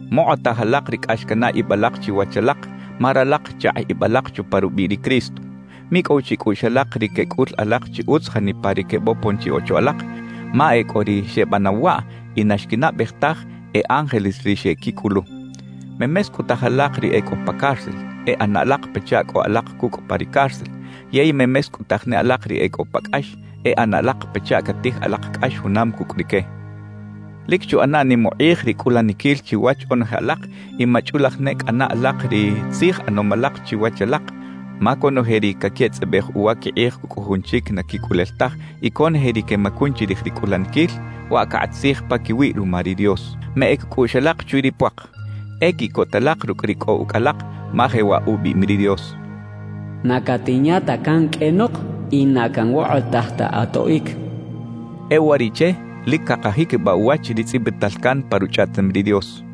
Mokꞌotaj alak ri cꞌax canaꞌ ib alak chiwach alak, ma ralak chakꞌ ib alak chupa rubiꞌ ri Cristo. Micꞌow chicꞌuꞌx alak ri quecꞌul alak chi utz janipa ri quebopon chi ocho alak, ma e cꞌo ri xebanaw waꞌ y na xquinaꞌbej taj e ángeles ri xequicꞌulu. Memescꞌutaj alak ri e cꞌo pa cárcel, e ꞌana alak pachaꞌ cꞌo alak cucꞌ pa ri cárcel; yey memescꞌutaj ne alak ri e cꞌo pa cꞌax, e ꞌana alak pachaꞌ catij alak cꞌax junam cucꞌ rique. Lic chuꞌana nim ukꞌij ri cꞌulaniquil chiwach onoje alak y machꞌulaj ne cꞌana alak ri tzij ꞌanom alak chiwach alak; ma conoje ri caquetzꞌabej uwa quikꞌij cucꞌ jujun chic na quicꞌulel taj y conoje ri quemacun chirij ri cꞌulaniquil, waꞌ cakꞌat tzij paquiwiꞌ ruma ri Dios. Meꞌec cꞌuꞌx alak chwi ri puak. E quiꞌcota alak rucꞌ ri cꞌo ucꞌ alak, ma jewaꞌ ubiꞌim ri Dios: Na catinya ta can qꞌuenok y na canwokꞌotaj ta atoꞌic xchaꞌ. E uwariꞌche lic cakajiquibaꞌ uwach ri tzꞌibital can pa Ruchꞌaꞌtem ri Dios: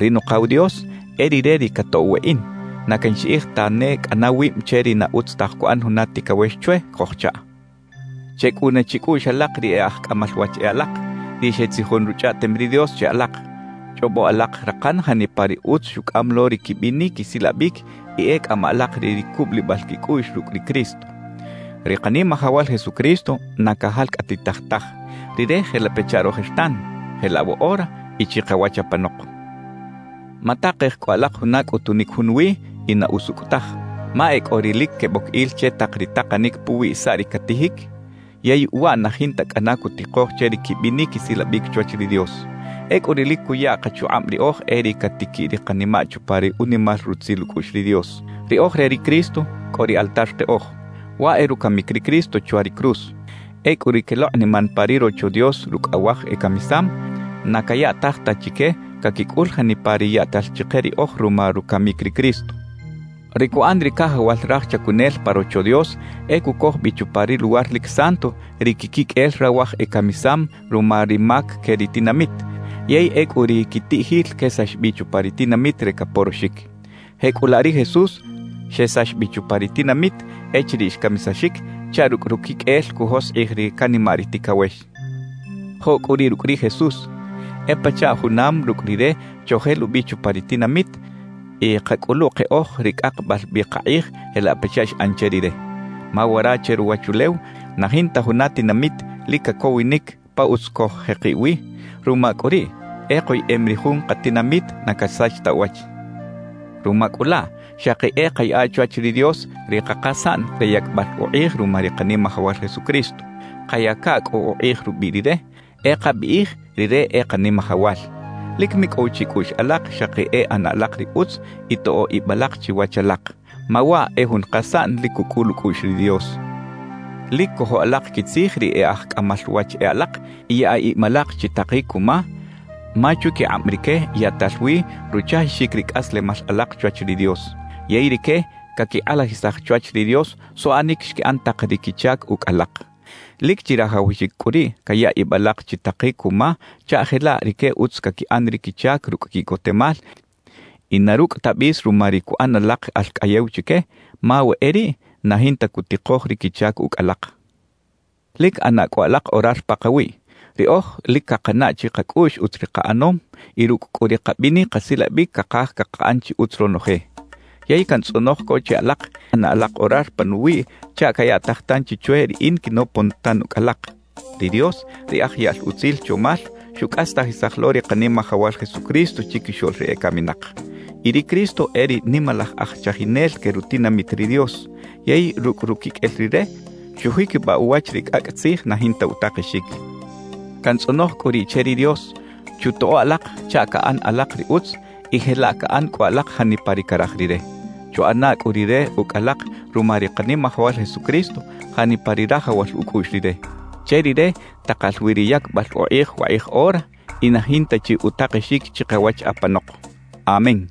Ri Nukaw Dios, e Rire ri catoꞌw weꞌin; na canxiꞌij tane cꞌana wib che ri na utz taj cuꞌan juna ticawex chwe cojchaꞌ. Checꞌuna chicꞌuꞌx alak ri e aj cꞌamal wach e alak, ri xetzijon Ruchꞌaꞌtem ri Dios che alak. Chꞌobo alak rakan janipa ri utz xucꞌam lo ri quibinic quisilabic y e cꞌama alak re ri cubulibal quicꞌuꞌx rucꞌ ri Cristo. Ri Kanimajawal Jesucristo na cajalcꞌatitaj taj; Rire jelaꞌ pachaꞌ rojertan, jelaꞌ woꞌora y chikawach apanok. Matakej cꞌu alak juna cꞌutunic junwi y na usucꞌ taj. Ma e cꞌo ri lic queboc il che tak ri takanic puwi saꞌ ri catijic, yey waꞌ na jinta cꞌana cutikoj che ri quibinic quisilabic chwach ri Dios. Ecꞌu ri lic cuya kachukꞌab riꞌoj e ri catiquiꞌ ri kanimaꞌ chupa ri unimal rutzil ucꞌuꞌx ri Dios. Ri oj re ri Cristo, cꞌo ri altar keꞌoj (waꞌ e rucamic ri Cristo chwa ri cruz). Ecꞌu ri quelokꞌniman pa ri Rocho Dios rucꞌ awaj ecamisam, na cayaꞌtaj ta chique caquicꞌul janipa ri yaꞌtal chike riꞌoj ruma rucamic ri Cristo. Ri cuꞌan ri cajawal raj chacunel pa Rocho Dios e cucoj bi chupa ri Luwar lic Santo ri quiquiqꞌuel rawaj ecamisam ruma ri mac que ri tinamit, yey ecꞌu ri quitiꞌjil quesax bi chupa ri tinamit re caporoxic. Jecꞌulaꞌ ri Jesús xesax bi chupa ri tinamit echiriꞌ xcamisaxic chaꞌ rucꞌ ruquiqꞌuel cujoskꞌij ri canimaꞌ ri ticawex. Joꞌ cꞌu riꞌ rucꞌ ri Jesús, e pachaꞌ junam rucꞌ Rire chojelubi chupa ri tinamit y kacꞌulu keꞌoj ri cꞌakbal bi kakꞌij jelaꞌ pachaꞌ xꞌan che Rire. Ma wara che ruwachulew na jinta juna tinamit lic cacowinic pa utz coj-jekiꞌ wi; ruma cꞌu riꞌ, e koyeꞌem ri jun katinamit na casach ta uwach. Ruma cꞌu laꞌ, xaki e kayaꞌa chwach ri Dios ri kakasaꞌn re yacbal ukꞌij ruma ri Kanimajawal Jesucristo. Kayaca cꞌu ukꞌij rubiꞌ Rire, e kabiꞌij Rire e Kanimajawal. Lic micꞌow chicꞌuꞌx alak xaki e ꞌana alak ri utz y toꞌo ib alak chiwach alak. Ma waꞌ e jun kasaꞌn lic cucꞌul ucꞌuꞌx ri Dios. Lic cojo alak quitzij ri e aj cꞌamal wach e alak y yaꞌa ib alak chitakic cuma, ma chwiquikꞌab rique yaꞌtal wi ruchajixic ri cꞌaslemal alak chwach ri Dios. Yey rique caquikꞌalajisaj chwach ri Dios suꞌanic xquiꞌan tak ri quichac ucꞌ alak. Lic chirajawaxic cꞌu riꞌ caya ib alak chitakic cuma chaꞌ jelaꞌ rique utz caquiꞌan ri quichac rucꞌ quiꞌcotemal y na rucꞌ ta bis ruma ri cuꞌan alak alcꞌayew chique; ma we e riꞌ, na jinta cutikoj ri quichac ucꞌ alak. Lic ꞌana cꞌu alak orar pakawiꞌ. Riꞌoj lic cakanaꞌ chikacꞌuꞌx utz ri kaꞌanom, y rucꞌ cꞌu ri kabinic kasilabic cakaj cakaꞌan chi utz ronoje. Yey cantzꞌonoj co che alak, e ꞌana alak orar panuwiꞌ chaꞌ cayaꞌtaj tanchi chwe riꞌin quinopon tan ucꞌ alak. Ri Dios, ri aj yaꞌl utzil chomal, xucꞌastajisaj lo ri Kanimajawal Jesucristo chiquixoꞌl ri ecaminak. Y ri Cristo e ri Nimalaj Aj Chajinel que rutinamit ri Dios; yey rucꞌ ruquiqꞌuel Rire, xujiquibaꞌ uwach ri cꞌacꞌ tzij na jinta utakexic. Cantzꞌonoj cꞌu riꞌ che ri Dios, chutoꞌo alak chaꞌ caꞌan alak ri utz y jelaꞌ caꞌan cꞌu alak janipa ri caraj Rire. Chuꞌana cꞌu Rire ucꞌ alak ruma ri Kanimajawal Jesucristo janipa ri rajawal ucꞌuꞌx Rire. Che Rire takal wi ri yacbal ukꞌij wakꞌij ora y na jinta chi utakexic chikawach apanok. Amén.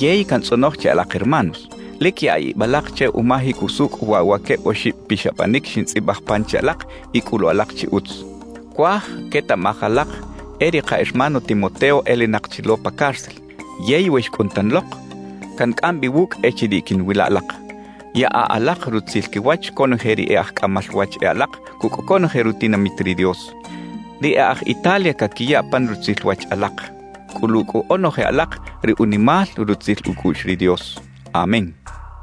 Yey cantzꞌonoj che alak hermanos, lic yaꞌa ib alak che umajic usucꞌ waꞌ wa queb oxib pixabanic xintzꞌibaj pan che alak y cꞌulu alak chi utz. Cuaj quetaꞌmaj alak e ri ka hermano Timoteo elinak chi lo pa cárcel, yey we xcꞌun tan lok, cancꞌam bi wucꞌ echiriꞌ quiꞌnwila alak. Yaꞌa alak rutzil quiwach conoje ri e aj cꞌamal wach e alak cucꞌ conoje rutinamit ri Dios. Ri e aj Italia caquiya pan rutzil wach alak. Cꞌulu cꞌu onoje alak ri unimal rutzil ucꞌuꞌx ri Dios. Amén.